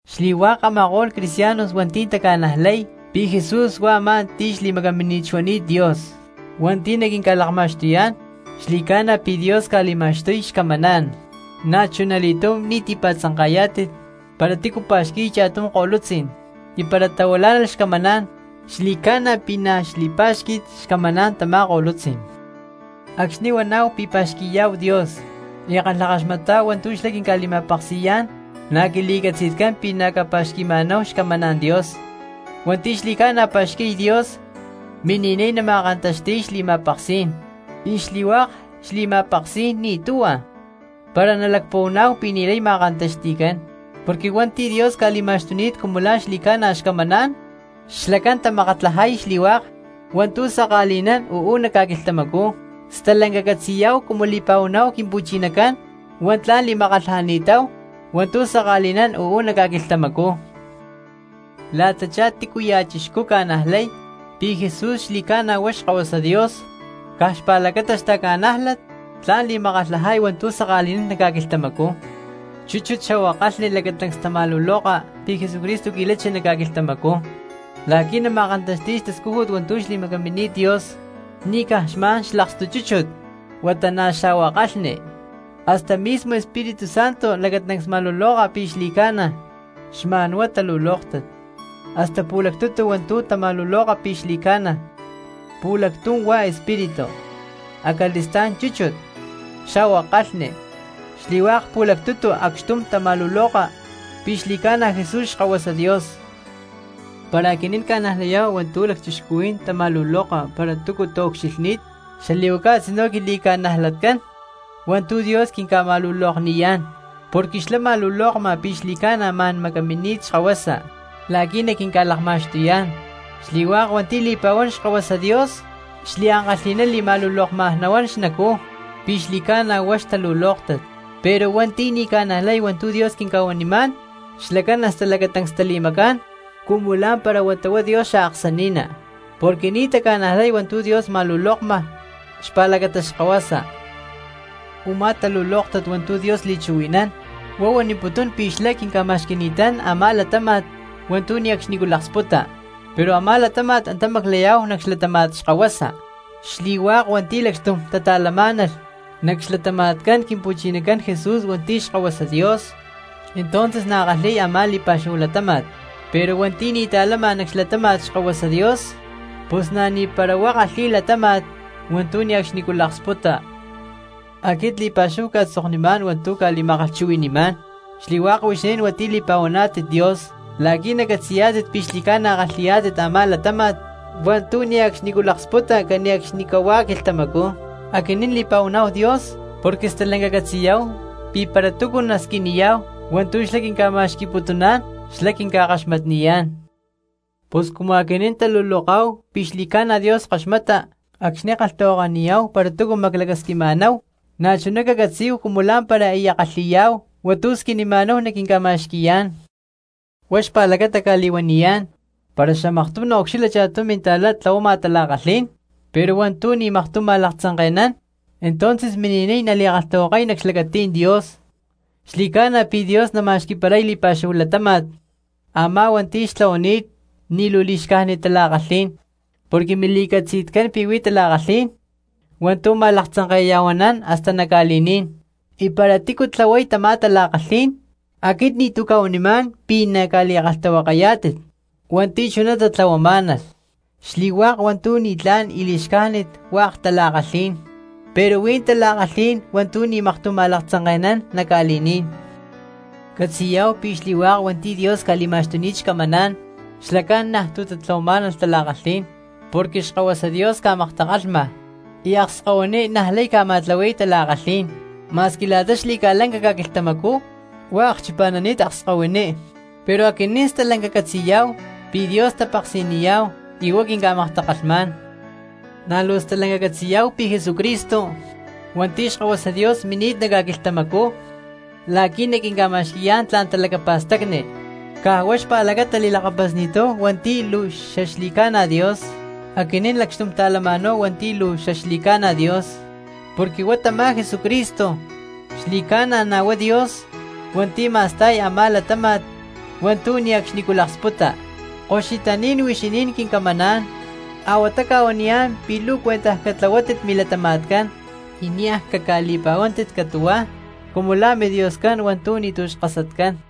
Xli̠hua̠k a̠ma̠ko̠lh cristianos hua̠nti̠ taca̠najlay pi̠ Jesús huá a̠má ti̠ xli̠macamínit xuani̠t Dios hua̠nti̠ naquinca̠lakma̠xtuyá̠n, xli̠ca̠na pi̠ Dios ca̠li̠ma̠xtuy xcamaná̠n. Na̠chunali̠túm ni̠ tipa̠tzanka̠yá̠tit para tícu pa̠xqui̠y cha̠tum ko̠lutzí̠n y para tahuilá̠nalh xcamaná̠n xli̠ca̠na pi̠ na̠ xli̠pá̠xqui̠t xcamaná̠n tamá ko̠lutzí̠n. Acxni̠ huaná̠hu pi̠ pa̠xqui̠yá̠hu Dios y kalhakaxmatá̠hu hua̠ntu̠ xlá quinca̠li̠ma̠peksi̠yá̠n na̠ quili̠catzi̠tcán pi̠ na̠ ca̠pa̠xqui̠ma̠náhu xcamaná̠n Dios. Hua̠nti̠ xli̠ca̠na pa̠xqui̠y Dios mini̠niy nama̠kantaxti̠y xli̠ma̠peksí̠n, y xli̠hua̠k xli̠ma̠peksí̠n ni̠ tuhua para nalacpuhuaná̠hu pi̠ ni̠lay ma̠kantaxti̠cán. Porque hua̠nti̠ Dios ca̠li̠ma̠xtuni̠t cumu la̠ xli̠ca̠na xcamaná̠n xlacán tamakatlajay xli̠hua̠k hua̠ntu̠ saka̠li̠nán uú nac ca̠quilhtamacú, stalanca catzi̠yá̠hu cumu li̠pa̠huaná̠hu Quimpu̠chinacán huá tla̠n li̠makatlajani̠táhu hua̠ntu̠ saka̠li̠nán uú nac ca̠quilhtamacú. La̠tachá tícuya̠ cristiano ca̠najlay pi̠ Jesús xli̠ca̠na huá Xkahuasa Dios, caj xpa̠lacata xtaca̠nájlat tla̠n li̠makatlajay hua̠ntu̠ saka̠li̠nán nac ca̠quilhtamacú. Chúchut xa̠hua kalhni lacatancs tama̠luloka pi̠ Jesucristo qui̠lachi nac ca̠quilhtamacú la̠qui̠ nama̠kantaxti̠y xtascújut hua̠ntu̠ xli̠macamini̠t Dios; ni̠ caj xma̠n xlakstu chúchut huata na̠ xa̠hua kalhni, hasta mismo Espíritu Santo lacatancs ma̠luloka pi̠ xli̠ca̠na, xlá xma̠n huá huan hua̠ntu̠ talulóktat. Hasta pu̠lactutu hua̠ntu̠ tama̠luloka pi̠ xli̠ca̠na: pu̠lactum huá Espíritu, acali̠stá̠n chúchut, xa̠hua kalhni; xli̠hua̠k pu̠lactutu acxtum tama̠luloka pi̠ xli̠ca̠na Jesús Xkahuasa Dios. Para aquinín ca̠najlayá̠hu hua̠ntu̠ lacchixcuhuí̠n tama̠luloka para túcu taucxilhní̠t, xali̠huaca a̠tzinú quili̠ca̠najlatcán hua̠ntu̠ Dios quinca̠ma̠lulokniyá̠n, porque xlá ma̠lulokma pi̠ xli̠ca̠na ma̠n macamini̠t Xkahuasa la̠qui̠ naquinca̠lakma̠xtuyá̠n. Xli̠hua̠k hua̠nti̠ tali̠pa̠huán Xkahuasa Dios xliankalhi̠ná li̠ma̠lulokma nahuán xnacú pi̠ xli̠ca̠na huá xtalulóktat; pero hua̠nti̠ ni̠ taca̠najlay hua̠ntu̠ Dios quinca̠huanimá̠n xlacán hasta lacatancs tali̠macá̠n cumu lá̠mpara huata huá Dios xaaksani̠ná, porque ni̠ taca̠najlay hua̠ntu̠ Dios ma̠lulokma xpa̠lacata Xkahuasa. Umá talulóktat hua̠ntu̠ Dios li̠chuhui̠nán huá huaniputún pi̠ xlá quinca̠ma̠xqui̠ni̠tán a̠má latáma̠t hua̠ntu̠ ne̠cxnicú laksputa, pero a̠má latáma̠t antá namaclayá̠hu nac xlatáma̠t Xkahuasa. Xli̠hua̠k hua̠nti̠ lacxtum tata̠lamá̠nalh nac xlatama̠tcán Quimpu̠chinacán Jesús hua̠nti̠ Xkahuasa Dios, entonces na̠ kalhi̠y a̠má li̠pa̠xúhu latáma̠t; pero hua̠nti̠ ni̠ ta̠lama nac xlatáma̠t Xkahuasa Dios pus na̠ ni̠para huá kalhi̠y latáma̠t hua̠ntu̠ ne̠cxnicú laksputa. Aquit li̠pa̠xúhu cca̠tzoknimá̠n hua̠ntu̠ cca̠li̠ma̠kalhchuhui̠ni̠má̠n xli̠hua̠k huixinín hua̠nti̠ li̠pa̠huaná̠tit Dios la̠qui̠ nacatzi̠yá̠tit pi̠ xli̠ca̠na kalhi̠yá̠tit a̠má latáma̠t hua̠ntu̠ ne̠cxnicú laksputa cane̠cxnicahuá quilhtamacú. Aquinín li̠pa̠huaná̠hu Dios porque stalanca catzi̠yá̠hu pi̠ para túcu nasquiniyá̠hu hua̠ntu̠ xlá quinca̠ma̠xqui̠putuná̠n, xlá quinca̠kaxmatniyá̠n. Pus cumu aquinín taluloká̠hu pi̠ xli̠ca̠na Dios kaxmata acxni̠ kalhtahuakaniyá̠hu para túcu maclacasquima̠náhu, na̠chuná cacatzí̠hu cumu lá̠mpara aya kalhi̠yá̠hu hua̠ntu̠ squinima̠náhu naquinca̠ma̠xqui̠yá̠n. Huá xpa̠lacata cca̠li̠huaniyá̠n, para xamaktum naucxilha cha̠tum minta̠cristiano tlahuama aktum tala̠kalhí̠n pero hua̠ntu̠ ni̠ maktum ma̠laktzanke̠nán, entonces mini̠niy nali̠kalhtahuakay nac xlacatí̠n Dios, xli̠ca̠na pi̠ Dios nama̠xqui̠paray li̠pa̠xúhu latáma̠t a̠má hua̠nti̠ xtlahuani̠t ni̠ luu li̠xcájnit tala̠kalhí̠n. Porque mili̠catzi̠tcán pi̠ huí tala̠kalhí̠n hua̠ntu̠ ma̠laktzanke̠ya̠huanán hasta nac ca̠li̠ní̠n, y para tícu tlahuay tamá tala̠kalhí̠n aquit ni̠tu̠ cca̠huanimá̠n pi̠ naca̠li̠kalhtahuakayá̠tit hua̠nti̠ chuná tatlahuamá̠nalh. Xli̠hua̠k hua̠ntu̠ ni̠tlá̠n y li̠xcájnit, hua̠k tala̠kalhí̠n, pero huí tala̠kalhí̠n hua̠ntu̠ ni̠ maktum ma̠laktzanke̠nán nac ca̠li̠ní̠n. Catzi̠yá̠hu pi̠ xli̠hua̠k hua̠nti̠ Dios ca̠li̠ma̠xtuni̠t xcamaná̠n, xlacán niaj tu̠ tatlahuamá̠nalh tala̠kalhí̠n porque Xkahuasa Dios ca̠maktakalhma y akskahuiní niajlay ca̠ma̠tlahui̠y tala̠kalhí̠n. Ma̠squi la̠ta xli̠ca̠lanca ca̠quilhtamacú huá akchipa̠nani̠t akskahuiní, pero aquinín stalanca catzi̠yá̠hu pi̠ Dios tapeksi̠niyá̠hu y huá quinca̠maktakalhmá̠n. Na̠ luu stalanca catzi̠yá̠hu pi̠ Jesucristo hua̠nti̠ Xkahuasa Dios mini̠t nac ca̠quilhtamacú la̠qui̠ naquinca̠ma̠xqui̠yá̠n tla̠n talacapa̠stacni caj huá xpa̠lacata li̠lakapasni̠táhu hua̠nti̠ luu xaxli̠ca̠na Dios. Aquinín lacxtum ta̠lama̠náhu hua̠nti̠ luu xaxli̠ca̠na Dios, porque huá tamá Jesucristo xli̠ca̠na na̠ huá Dios hua̠nti̠ ma̠sta̠y a̠má latáma̠t hua̠ntu̠ ne̠cxnicú laksputa. Koxutaní̠n huixinín quincamaná̠n, a̠huatá cca̠huaniyá̠n pi̠ luu cuentaj catlahuátit milatama̠tcán, y niaj caca̠li̠pa̠huántit catu̠hua cumu la̠ midioscán hua̠ntu̠ ni̠tu̠ xkasatcán.